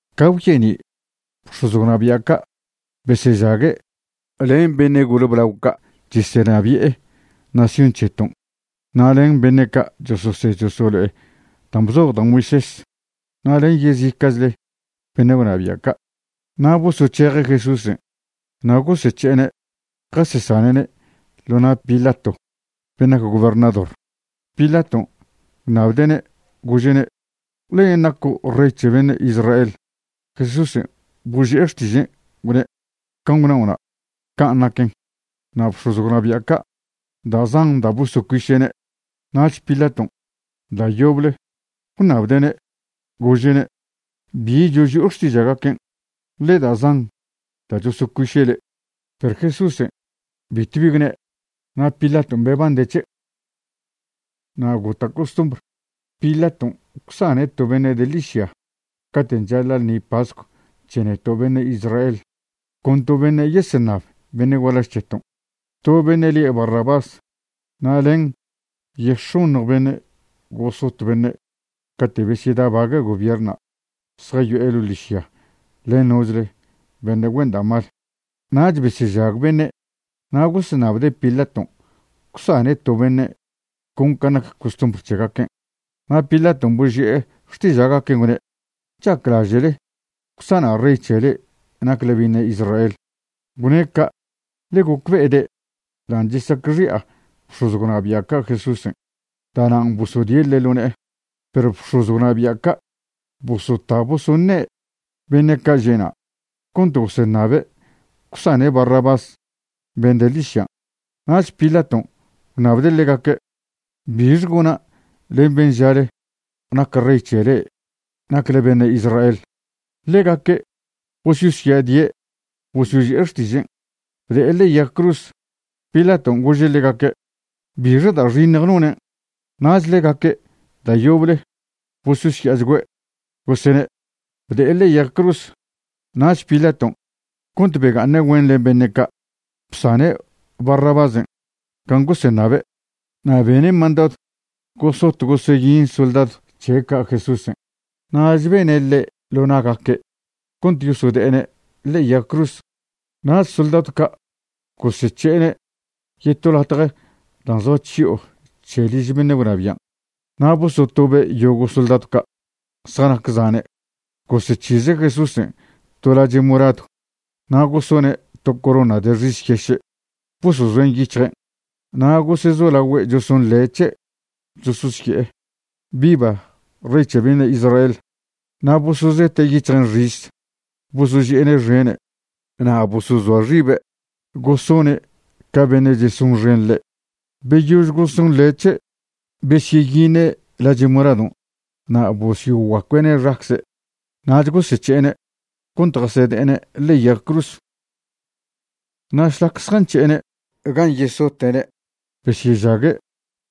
Ca gwyeni', bx̱oz gwnabia' ca' besežague' len beṉe' gole blao ca' chesenabi'e nación c̱heton' na' len beṉe' ca' chososed chosolo'e dan' bzoj da' Moisés na' len yezica'chle beṉe' gwnabia' ca'. Na' bosoc̱heje' Jesúsen' na' gosec̱he'ene' jasesane'ne' ḻo na' Pilato ben' nac gobernador. Pilaton' gwṉabde'ne', gože'ne': ―¿Len' naco' rey c̱he beṉe' Israel? Jesúsen' boži'e xtižen', gwne': ―Can' gwnao'na', can' naquen. Na' bx̱oz gwnabia' ca' da' zan da' bosocuiše'ne'. Nach Pilaton' da' yoble gwṉabde'ne', gože'ne': ―¿Bi choži'o xtiža'gaquen'? ḻe da' zan da' chosocuiše' le'. Perw Jesúsen' bitw bi gwne'. Na' Pilaton' bebande' c̱he'. Na' gota' costumbr, Pilaton' gwsane' to beṉe' de ḻižya caten' chaḻa' ḻṉi pascw c̱he neto' beṉe' Israel, con to beṉe' yeseṉab beṉe' gualaž c̱heton'. To beṉe' lie' Barrabás na' len yex̱oṉj bene' gosot beṉe' cate' besyedabague' gobierṉna' zjayo'e ḻo' ḻižya len nochle beṉe' güen da' mal. Nach besežag beṉe' na' goseṉabde' Pilaton' gwsane' to beṉe' con can' nac costumbr c̱hegaquen'. Na' Pilaton' boži'e xtiža'gaquen' gwne': ―¿Chaclaže'le gwsana' rey c̱he le'e nacle beṉe' Israel? Gwne' ca' ḻe gocbe'ede' dan' chesacxi'a bx̱oz gwnabi'a ca' Jesúsen', da'nan' bosodie' ḻe' ḻo ne'e. Perw bx̱oz gwnabia' ca' bosota bosoṉe' beṉe' ca' že' na' cont goseṉabe' gwsane' Barrabás ben' de ḻižyan'. Nach Pilaton' gwṉabde' ḻegaque': ―¿Bixe gona' len ben' žale nac rey c̱he le'e nacle beṉe' Israel? Ḻegaque' bososya'adie' bosyoži'e xtižen': ―¡Bde'e ḻe'e yag cruz! Pilaton' gože' ḻegaque': ―¿Bixe da' xiṉj nonen'? Nach ḻegaque' da' yoble bososya'achgüe' gosene': ―¡Bde'e ḻe'e yag cruz! Nach Pilaton', cont bega'aṉe' güen len beṉe' ca', bsane' Barrabásen' can' goseṉabe'. Na' bene' mandadw gosot goseyin soldadw c̱he' ca' Jesúsen', nach beṉe' ḻe' ḻo na'gaque' cont yosode'ene' ḻe'e yag cruz. Nach soldadw ca' gosec̱he'ene' yeto latje dan' zoa chyo'o c̱he liž beṉe' gwnabian', na' bosotobe' yogo' soldadw ca', zjanac zane'. Gosec̱hize' Jesúsen' to lache' moradw, na' gosone' to corona de xis yeše' bosozoen' yic̱hjen'. Na' gosezolagüe' chesonḻe' c̱he', chesosye'e: ―¡Viva, rey c̱he beṉe' Israel! Na' bosozete' yic̱hjen' xis, bosoži'ene' xene', na' bosozoa xibe' gosone' ca beṉe' chesonxen ḻe'. Beyož gosonḻe' c̱he', besyeyiṉe' lache' moradon' na' bosyoguacue'ne' xacze'. Nach gosec̱he'ene' cont jasede'ene' ḻe'e yag cruz. Na' šlac zjanc̱he'ene' gan' yesote'ne' besyežague'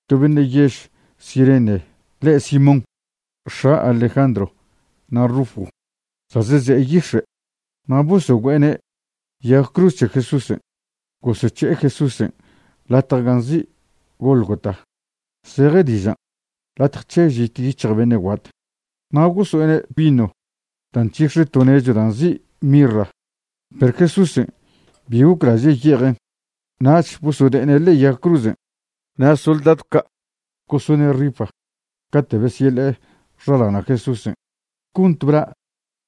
to beṉe' yež Cirene le' Simón, x̱a Alejandro na' Rufo, za' zeze'e yix̱e', na' bosogüe'ene' yag cruz c̱he Jesúsen'. Gosec̱he'e Jesúsen' latje ga nzi' Gólgota, zeje dižan' Latje c̱he Žit Yic̱hj Beṉe' Guat. Na' goso'ene' vino da' nc̱hix̱e to nechw da' nzi' mirra, perw Jesúsen' bi goclaže' ye'ejen'. Nach bosode'ene' ḻe'e yag cruzen'. Na' soldadw ca' gosone' rifa cate' besyeḻe'e xaḻana' Jesúsen' cont bla'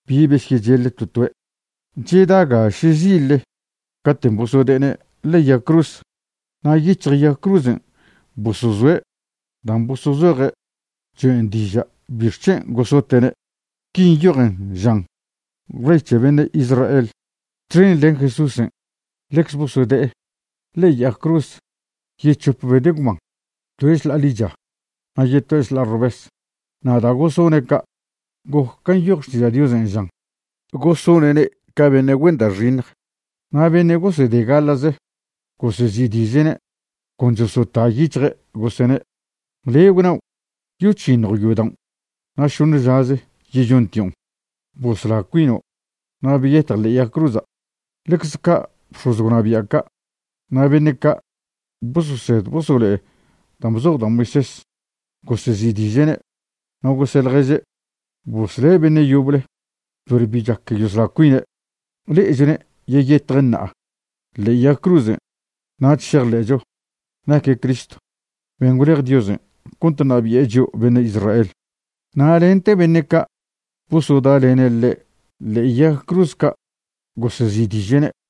bi besyecheḻ to toe'. Cheda ga šezille caten' bosode'ene' ḻe'e yag cruz. Na' yic̱hj yag cruzen' bosozoe' dan' bosozoje' choen' diža' bixc̱hen' gosote'ne'. Qui nyojen, žan: “Rey c̱he Beṉe' Israel.” Txen len Jesúsen' ḻecze bosode'e ḻe'e yag cruz yec̱hope beṉe' gwban, toe' šḻa'a ḻicha, na' yetoe' šḻa'a robes. Na' da' gosone' ca', goc ca nyoj Xtiža' Diosen', žan: “Gosone'ne' ca beṉe' güen da' xiṉj.” Na' beṉe' gosede gaḻa'ze gosezi'diže'ne', con chosota yic̱hje' gosene': ―Le' gwnao' yoc̱hiṉjo' yodaon' na' šoṉe žaze yeyontion'. Bosla cuino' na' beyetj ḻe'e yag cruza'. Ḻecze ca' bx̱oz gwnabia' ca' na' beṉe' ca' bososed bosolo'e dan' bzoj da' Moisés gosezi'diže'ne', na' gose' ḻježe': ―Bosle' beṉe' yoble, perw bi chac yosla cuine'. Le'echone' yeyetje' ṉa'a ḻe'e yag cruzen', nach šejḻe'cho naque' Cristo ben' gwlej Diosen' cont ṉabi'e chio' beṉe' Israel. Na' lente beṉe' ca' bosoda'lene' ḻe' ḻe'e yag cruz ca' gosezi'diže'ne'.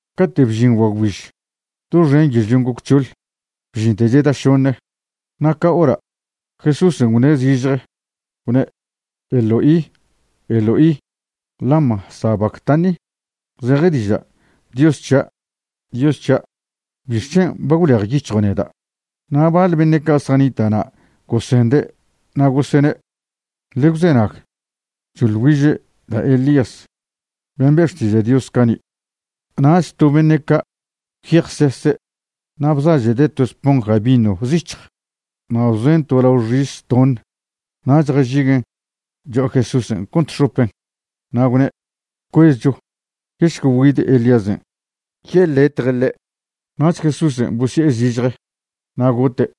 Cate' bžin guagwbiž, doxen yežlion' goc c̱hoḻ, bžinte cheda šoṉe. Na' ca hora' Jesúsen' gwṉe' zižje gwne': ―Eloi, Eloi ¿lama sabactani? ―zeje diža': Dios c̱hia', Dios c̱hia', ¿bixc̱hen' ba gwlejyic̱hjo' neda'? Na' baḻ beṉe' ca' zjanita' na' gosende' na' gosene': ―Ḻe gwzenag, choḻ güiže' da' Elías, ben' be' xtiža' Dios cani'. Nach to beṉe' ca' gwyejsese' na' bzažede' to esponja vino zic̱hj na' bzoen' to lao xis toṉe nach jažiguen' cho'a Jesúsen' cont xopen', na' gwne': ―Cuezcho, yešque güid Elíasen' yeḻetje' ḻe'. Nach Jesúsen' bosye'e zižje, na' gote'.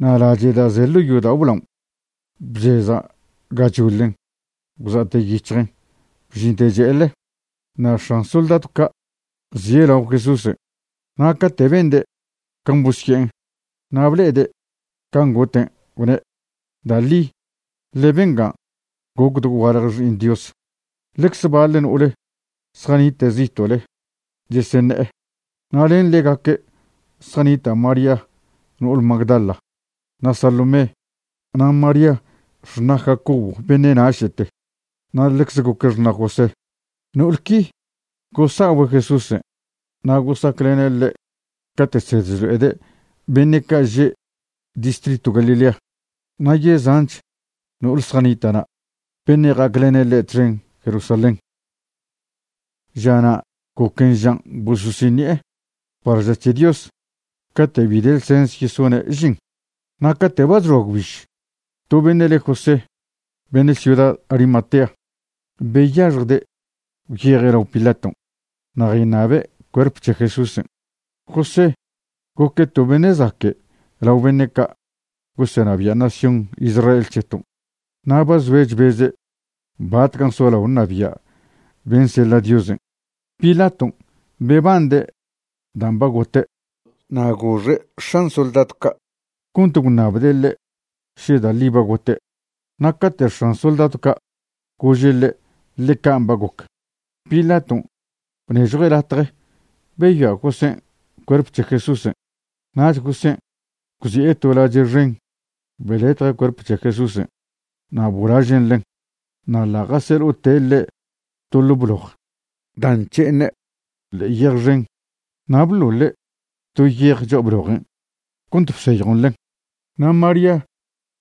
Na' lache' da' ze ḻo' yodao' blaon' bcheza' gachoḻen, gwza'te yic̱hjen bžinte che'eḻe. Na' x̱an soldadw ca' zie' lao Jesúsen', na' cate' bende' can' bosye'en na' ble'ede' can' goten', gwne': ―Da' ḻi ḻe bengan' goc dogualje Xi'iṉ Dios. Ḻecze baḻ no'ole zjanite' zito'le cheseṉe'e. Na' len ḻegaque' zjanita' María no'ole Magdala, na' Salomé, na' María xṉa' Jacobo beṉe' naše'te, na' ḻecze goque' xṉa' José. No'ol qui gosa'ogüe' Jesúsen' na' gosaclene' ḻe' cate' chsed chlo'ede' beṉe' ca' že' distritw Galilea. Na' yezanch no'ol zjanita' na', beṉe' ja'aclene' ḻe' txen Jerusalén. Žana' goquen žan' bososiṉi'e par ža c̱he Dios cate' bi de ḻsens yesone' žin. Na' cate' ba chxoa gwbiž, to beṉe' le' José, beṉe' ciuda Arimatea, beyaxjde' gwyeje' lao Pilaton' na' jayṉabe' cuerp c̱he Jesúsen'. José goque' to beṉe' zaque' lao beṉe' ca' gosenabi'e nación Israel c̱heton', na' ba zoe' chbeze' batcan' solao ṉabia' ben' seḻa' Diosen'. Pilaton' bebande' dan' ba gote', na' goxe' x̱an soldadw ca' cont gwṉabde' ḻe' še da' ḻi ba gote'. Na' cate' x̱an soldadw ca' gože' ḻe' ḻe can' ba goc, Pilaton' bnežjue' latje beyoa' Josén' cuerp c̱he' Jesúsen'. Nach Josén' gwzi'e to lache' xen, beḻetje' cuerp c̱he Jesúsen' na' bolažen' ḻen. Na' ḻa' jaseḻo'ote' ḻe' to ḻo' bloj da' nc̱he'eṉe' ḻe'e yej xen, na' bḻoḻe' to yej cho'a blojen' cont bseyjon ḻen. Na' María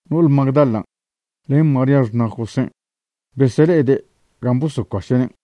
no'ole Magdalan' len María xṉa' Josén' besele'ede' gan' bosocuaše'nen'.